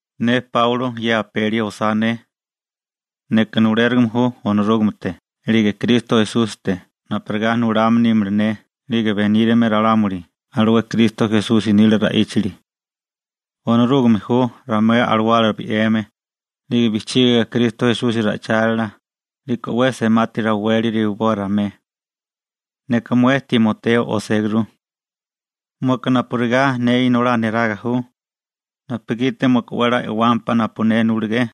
Ne Páulo ye apeli osá ne. Neka nulérigime ju Onorúgamete 'lige Kristo Esúsite napurigá nulame nímala ne 'lige benírame ralámuli alué Kristo Esusi nila ra'íchali. Onorúgame ju ramué alawala bi'weme, 'lige bijchígiga Kristo Esusi ra'ichálila, 'liko 'we semati raweli rewiboa ramué. Neka mué Timoteo oséguru. Mueka napurigá ne inolá neraga ju, napugiti mueka 'we 'la e'wámpá napu ne nulegé.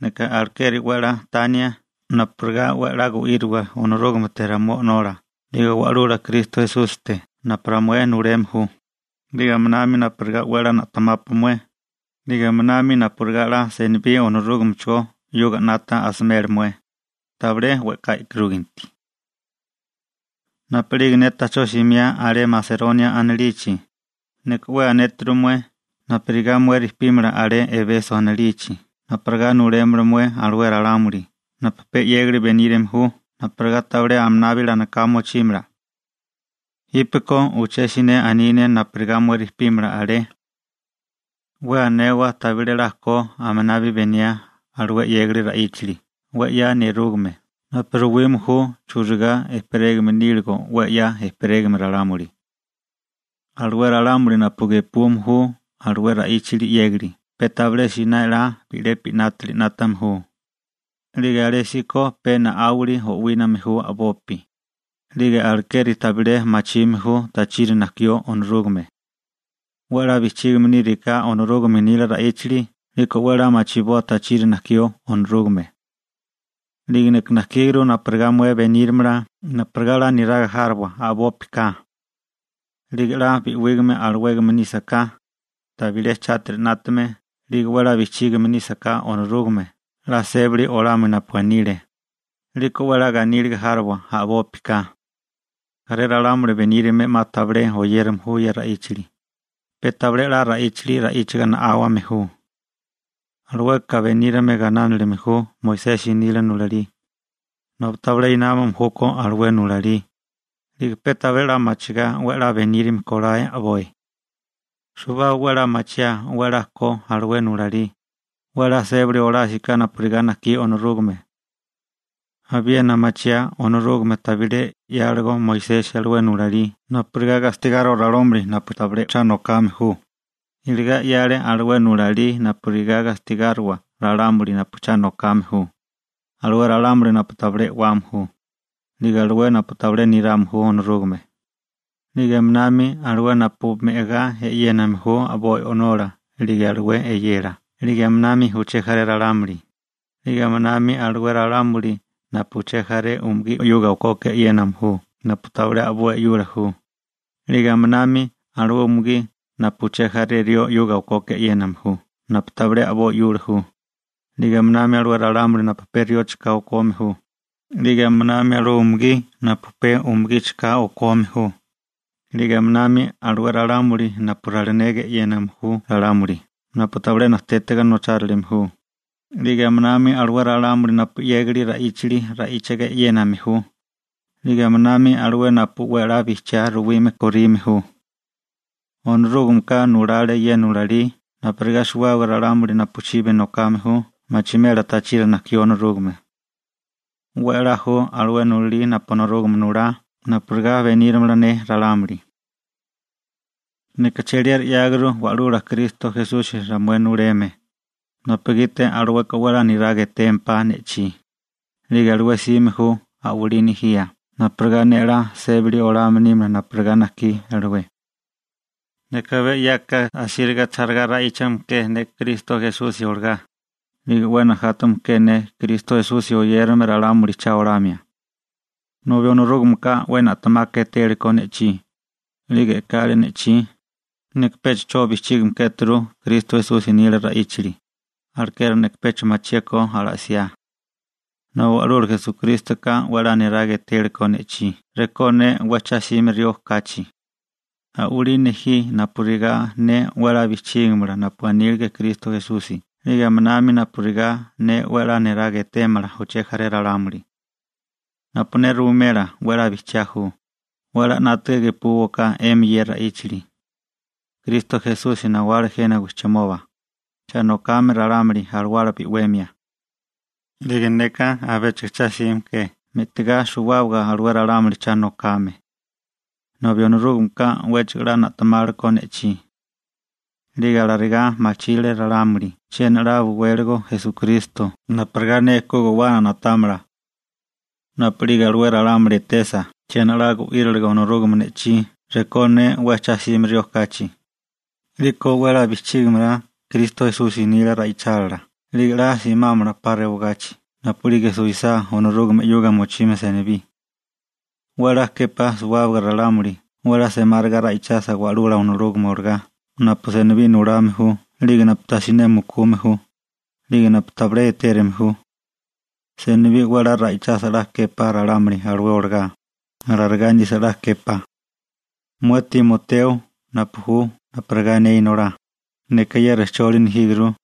Neka alekeri 'we 'la tania napurigá 'we 'la gu'íriwa Onorúgamete ramué O'nola 'lige Wa'lula Kristo Esúsite napu ramué nuleme ju, 'lige aminami napurigá 'we 'la na'temápua mué, 'lige aminami napurigá 'la senibí Onorúgamecho 'yuga 'nata asimela mué, tabilé we'ká e'karúginti. Napu'lige ne ta'chó simiá alé Maseronia anilichi, neka 'we anéturu mué napurigá mué rejpímala alé Ebeso anilichi napurigá nulémala mué alué ralámuli napu pe 'yégali benírame ju napurigá tabilé aminabi alanoká mochímala. Jípeko uché siné aní ne napurigá mué rejpímala alé. 'We anewa tabilé 'la ko aminabi beniaa alué 'yégali ra'íchali 'we 'ya nerúgame napu ruwime ju churigá ejperégame níligo 'we 'ya ejperégame ralámuli. Alué ralámuli napu gepume ju alué ra'íchali 'yégali pe tabilé siné 'la bi'lepi 'nátali 'nátame ju, 'lige alésíko pe na'áwali o'wíname ju a'bopi, 'lige alekeri tabilé machime ju tachiri najkió Onorúgame. 'We 'la bijchígame níriká Onorúgame nila ra'íchali 'liko 'we 'la machiboa tachiri najkió Onorúgame. 'Lige neka najkíguru napurigá mué benírimala napurigá 'la niraga járowa a'bópika. 'Lige 'la bi'wígame alawégame nísaká, tabilé chátiri 'nátame 'lige 'we 'la bijchígame nísaká Onorúgame 'la sébali olamio napu anile, 'liko 'we 'la ganíliga járowa a'bópika. Jaré ralámuli benírame 'ma tabilé oyérame ju ye ra'íchali, pe tabilé 'la ra'íchali ra'íchaga na'áwame ju. Alueka benírame gainánilime ju Moisesi nila nulalí, nobi tabilé námame júkó alué nulalí, 'lige pe tabilé machigá 'we 'la benírame kolae a'boi. Suwábaga 'we 'la machiaa 'we 'la ko alué nulalí, 'we a'lá sébili olásiká napurigá najkí Onorúgame. Abiena machiaa Onorúgame tabilé 'yáligo Moisesi alué nulalí napurigá gastigáriwa 'la a'ká ralámuli, iligá 'yale alué nulalí napurigá gastigáriwa ralámuli napu cha nokame ju, alué ralámuli napu tabilé e'wame ju, 'lige alué napu tabilé nirame ju Onorúgame, 'lige aminami alué napu me'gá e'yéname ju a'boi o'nola 'lige alué e'yela 'lige aminami uché jaré ralámuli, 'lige aminami alué ralámuli napu uché jaré umugí 'yuga okoka e'yéname ju napu tabilé a'boi 'yula ju, 'lige aminami alué umugí napu uché jaré rió 'yuga okoka e'yéname ju napu tabilé a'boi 'yula ju, 'lige aminami alué ralámuli napu pe riocho ka okome ju, 'lige aminami alué umugí napu pe umugicho ka okome ju, 'lige aminami alué ralámuli napu ralinega e'yéname ju ralámuli napu tabilé najtétiga nochárilime ju, 'lige aminami alué ralámuli napu 'yégali ra'íchali ra'íchiga e'yéname ju, 'lige aminami alué napu 'we 'la bijchiá ruwime korime ju. Onorúgameka nulale ye nulalí napurigá suwábaga ralámuli napu chibi nokame ju machimela tachiri najkió Onorúgame. 'We 'la ju alué nulalí napu Onorúgame nulá napurigá benírimala ne ralámuli. Neka cheliera 'yáguru Wa'lula Kristo Esusi ramué nuleme, napugiti alueka 'we 'la niraga etémpá ne'chí, 'lige alué 'sime ju a'walí nejía napurigá ne 'la sébali olame nímala napurigá najkí alué. Neka abé 'yako asíriga chálagá ra'íchame ke ne Kristo Esusi olagá, 'lige 'we najátame ke ne Kristo Esusi oyérame ralámuli cha olamia. Nobi Onorúgameka 'we na'temaka etélekó ne'chí, 'lige e'kale ne'chí, neka pecha 'cho bijchígame kéturu Kristo Esusi nila ra'íchali, alekeri neka pecha machiékó ala'siá. Nobi Wa'lula Esukrístoka 'wéchigo 'la niraga etélekó ne'chí rekó ne 'we cha 'sime rió kachi. A'walí nejí napurigá ne 'we 'la bijchígimala napu anílige Kristo Esusi 'lige aminami napurigá ne 'we 'la niraga etémala uché jaré ralámuli. Napu ne ruwimela 'we 'la bijchiá ju, 'we 'la 'nátaga gepúwaká 'emi ye ra'íchali. Kristo Esusi nawale jena wijchimoba, cha nokame ralámuli alawala bi'wemia. 'Lige neka abéchigo cha 'sime ke me'tigá suwábaga alué ralámuli cha nokame. Nobi Onorúgameka 'wéchigo 'la na'temálekó ne'chí. 'Lige alarigá machírile ralámuli chiena 'la buwéligo Esukristo napurigá ne ku guwana na'támala. Napu'lige alué ralámuli etesa chiena 'la gu'íriligo Onorúgame ne'chí rekó ne 'we cha 'sime rió kachi, 'liko 'we 'la bijchígimala Kristo Esusi nila ra'ichálila 'lige 'la simámala 'pa rewagachi napu'lige suwisá Onorúgame 'yuga mochimia senibí. 'We 'la képá suwábaga ralámuli 'we 'la semáriga ra'ichasa Wa'lula Onorúgame olagá napu senibí nulame ju 'lige napu tajsiné mukume ju, 'lige napu tabilé etérume ju. Senibí 'we 'la ra'ichasa 'la képá ralámuli alué olagá, alarigá nisa 'la képá. Mué Timoteo, napu ju napurigá ne inolá, neka ye rejcholi nejíguru,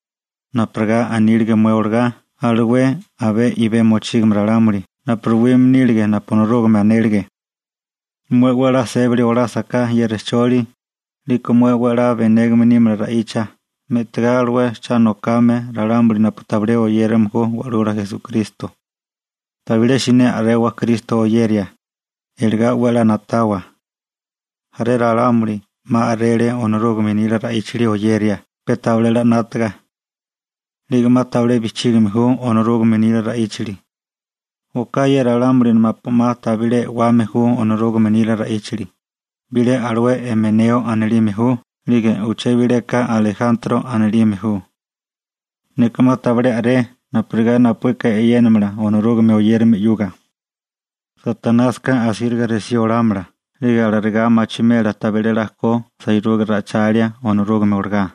napurigá anílige mué olagá alué abé i'bé mochígame ralámuli napu ruwime nílige napu Onorúgame anélige. Mué 'we 'la sébali olásaká ye rejcholi, 'liko mué 'we 'la benégame nímala ra'icha me'tigá alué cha nokame ralámuli napu tabilé oyérame ju Wa'lula Esukristo. Tabilé siné a'rewa Kristo oyeria, iligá 'we 'la na'tawa. Jaré ralámuli 'ma a'rele Onorúgame nila ra'íchali oyeria pe tabilé 'la 'nátaga. 'Lige 'ma tabilé bijchígime ju Onorúgame nila ra'íchali. Oká ye ralámuli napu 'ma tabilé e'wame ju Onorúgame nila ra'íchali, bilé alué Imeneo anilime ju 'lige uché bileka Alejantro anilime ju. Neka 'ma tabilé a'ré napurigá napuíka e'yénamala Onorúgame oyérame 'yuga. Satanásika asíriga resí olámala 'lige alarigá machimela tabilé 'la ko sairuga ra'ichalia Onorúgame olagá.